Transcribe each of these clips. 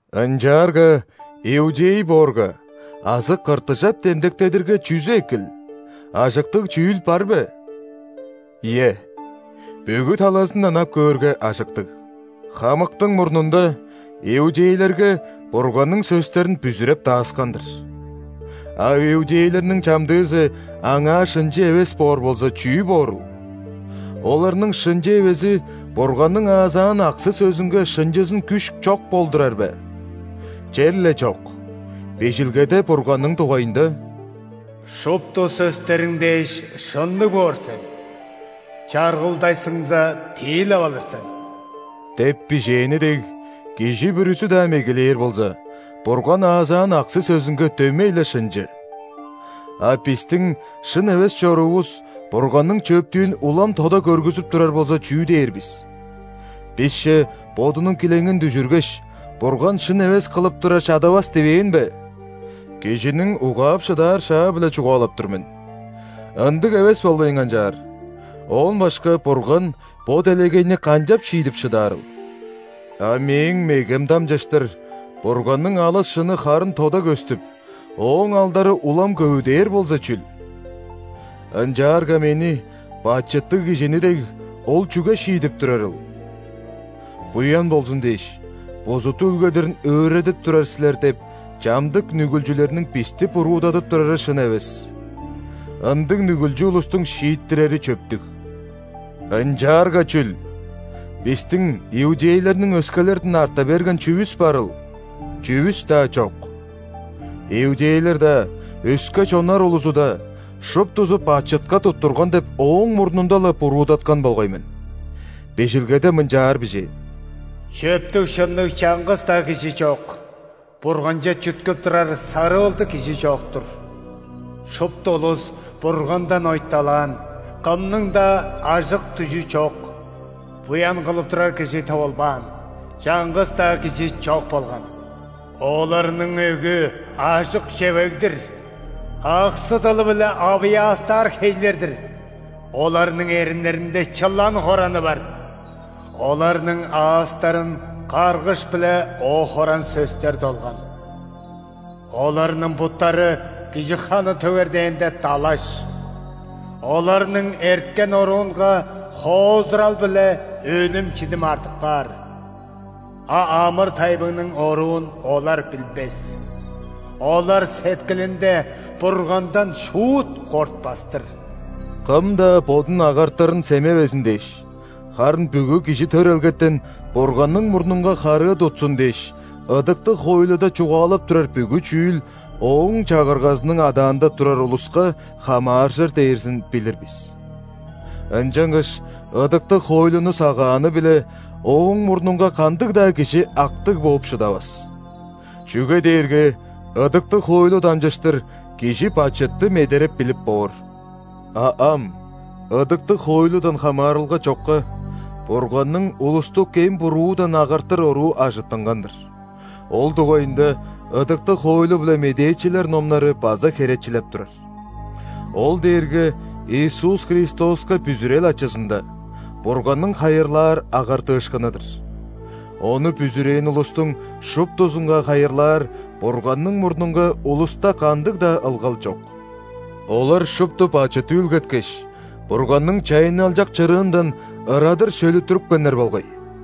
Ынчаарга иудей боорга азы ·кыртыжап демдектедирге, чүзү экил, ажыктыг чүүл бар бе?. – Ийе, бүгү талазындан ап көөрге, ажыктыг. Хамыктың мурнунда, иудейлерге Бурганның сөстерин бүзүреп дааскан-дыр. – А иудейлерниң чамдыызы Аңаа шынчы эвес боор болза, чүү боорул? Оларның шынчы эвези Бурганның аазаан аксы-сөзүнге шынчызын күш чок болдурар бе? – Черле чок! Бижилгеде Бурганның дугайында: «Шупту сөстериң дээш, шынныг боор сен, чаргылдашсыңза, тиилеп алыр сен» деп бижээни дег, кижи бүрүзү-даа мегелээр болза, Бурган аазаан аксы-сөзүнге дөмей-ле шынчы. – А бистиң шын эвес чоруувус Бурганның чөптүүн улам тода көргүзүп турар болза, чүү дээр бис? Бисче Бодунуң килеңин дүжүргеш, Бурган шын эвес кылып турар чадавас дивээн бе? (Кижиниң угаап шыдаар шаа-биле чугаалап тур мен.) – Ындыг эвес болбайн канчаар! Оон башка Бурган бо делегейни канчап шиидип шыдаарыл? – А мээң мегем дамчыштыр Бурганның алыс шыны харын тода көстүп, Ооң алдары улам көвүдээр болза чүл? Ынчаарга мени, бачыттыг кижини дег, Ол чүге шиидип турарыл? «Буян болзун дээш, бузут үүлгедирин өөредип турар силер» – деп, чамдык нүгүлчүлерниң бисти буруудадып турары шын эвес. Ындыг нүгүлчү улустуң шииттирери чөптүг! – Ынчаарга чүл? Бистиң, иудейлерниң, өскелерден арта берген чүвүс барыл? – Чүвүс-даа чок. Иудейлер-даа, өске чоннар улузу-даа – шуптузу бачытка туттурган деп ооң мурнунда-ла буруудаткан болгай мен. Бижилгеде мынчаар бижээн:«Чөптүг-шынныг чаңгыс-даа кижи чок. Бурганче чүткүп турар сарыылдыг кижи чок-тур. Шупту улус Бургандан ойталаан, кымның-даа ажык-дүжүү чок;буян кылып турар кижи тывылбаан –чаңгыс-даа кижи чок болган». «Оларның өгү – ажык чевег-дир;аксы-дылы-биле авыяастаар хейлер-дир»:«Оларның эриннеринде чылан хораны бар». «Оларның аастарын каргыш биле оо-хоран сөстер долган». «Оларның буттары кижи ханы төгер дээнде – далаш. Оларның эрткен оруунга хоозурал биле өлүм-чидим артып каар; а амыр-тайбыңның оруун олар билбес». «Олар сеткилинде Бургандан шуут кортпас-тыр». Кым-даа бодун агартырын семевезин дээш, харын бүгү кижи төрелгетен Бурганның мурнунга харыы тутсун дээш, ыдыктыг хоойлуда чугаалап турар бүгү чүүл ооң чагыргазының адаанда турар улуска хамааржыр дээрзин билир бис. Ынчангаш ыдыктыг хоойлуну сагааны-биле Ооң мурнунга кандыг-даа кижи актыг бооп шыдавас. Чүге дээрге ыдыктыг хоойлу дамчыштыр кижи бачытты медереп билип боор. А ам, ыдыктыг хоойлудан хамаарылга чокка, Бурганның улусту кем-буруудан агартыр оруу ажыттынган-дыр, ол дугайында ыдыктыг хоойлу биле медээчилер номнары база херечилеп турар. Ол дээрге Иисус Христоска бүзүрел ачызында, Бурганның хайырлаар агартыышкыны-дыр, ону бүзүрээн улустуң шуптузунга хайырлаар Бурганның мурнунга улуста кандыг-даа ылгал чок: олар шупту бачыт үүлгеткеш, Бурганның чайынналчак чырыындан ырадыр шөлүттүрүпкеннер болгай.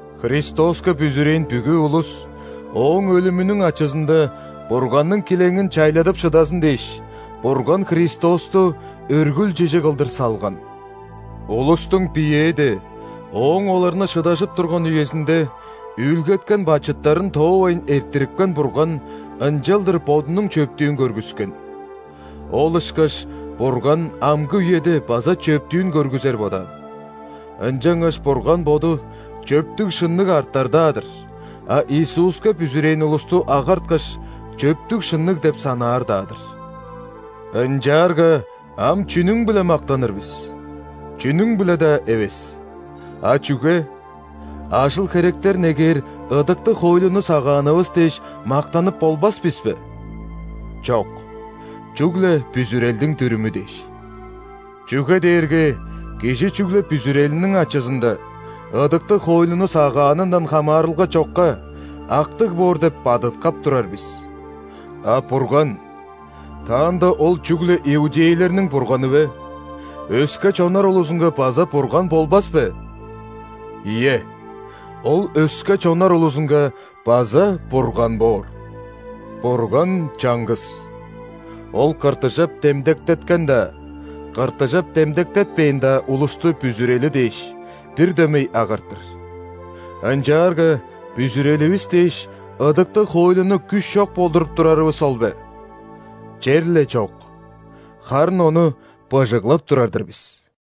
Христоска бүзүрээн бүгү улус Ооң өлүмүнүң ачызында Бурганның килеңин чайладып шыдазын дээш, Бурган Христосту өргүл чижи кылдыр салган. Улустуң биеэде – Ооң оларны шыдажып турган үезинде – үүлгеткен бачыттарын тоовайн эрттирипкен Бурган ынчалдыр Бодунуң чөптүүн көргүскен. Ол ышкаш Бурган амгы үеде база чөптүүн көргүзер бодаан. Ынчангаш Бурган Боду чөптүг-шынныг артар-даа-дыр, а Иисуска бүзүрээн улусту агарткаш, чөптүг-шынныг деп санаар-даа-дыр. – Ынчаарга ам чүнүң-биле мактаныр бис? – Чүнүң-биле-даа эвес. – А чүге? Ажыл-херектер негээр ыдыктыг хоойлуну сагаанывыс дээш, мактанып болбас бис бе? – Чок! Чүгле бүзүрелдиң дүрүмү дээш. Чүге дээрге кижи чүгле бүзүрелиниң ачызында, ыдыктыг хоойлуну сагаанындан хамаарылга чокка, актыг боор деп бадыткап турар бис. – А Бурган? Таанда Ол чүгле иудейлерниң Бурганы бе? Өске чоннар улузунга база Бурган болбас бе? – Ийе, Ол өске чоннар улузунга база Бурган боор. Бурган чаңгыс. Ол ·кыртыжап демдектеткен-даа, кыртыжап демдектетпээн-даа улусту бүзүрели дээш, бир дөмей агартыр. – Ынчаарга бүзүреливис дээш, ыдыктыг хоойлуну күш чок болдуруп турарывыс ол бе? – Черле чок! Харын ону быжыглап турар-дыр бис.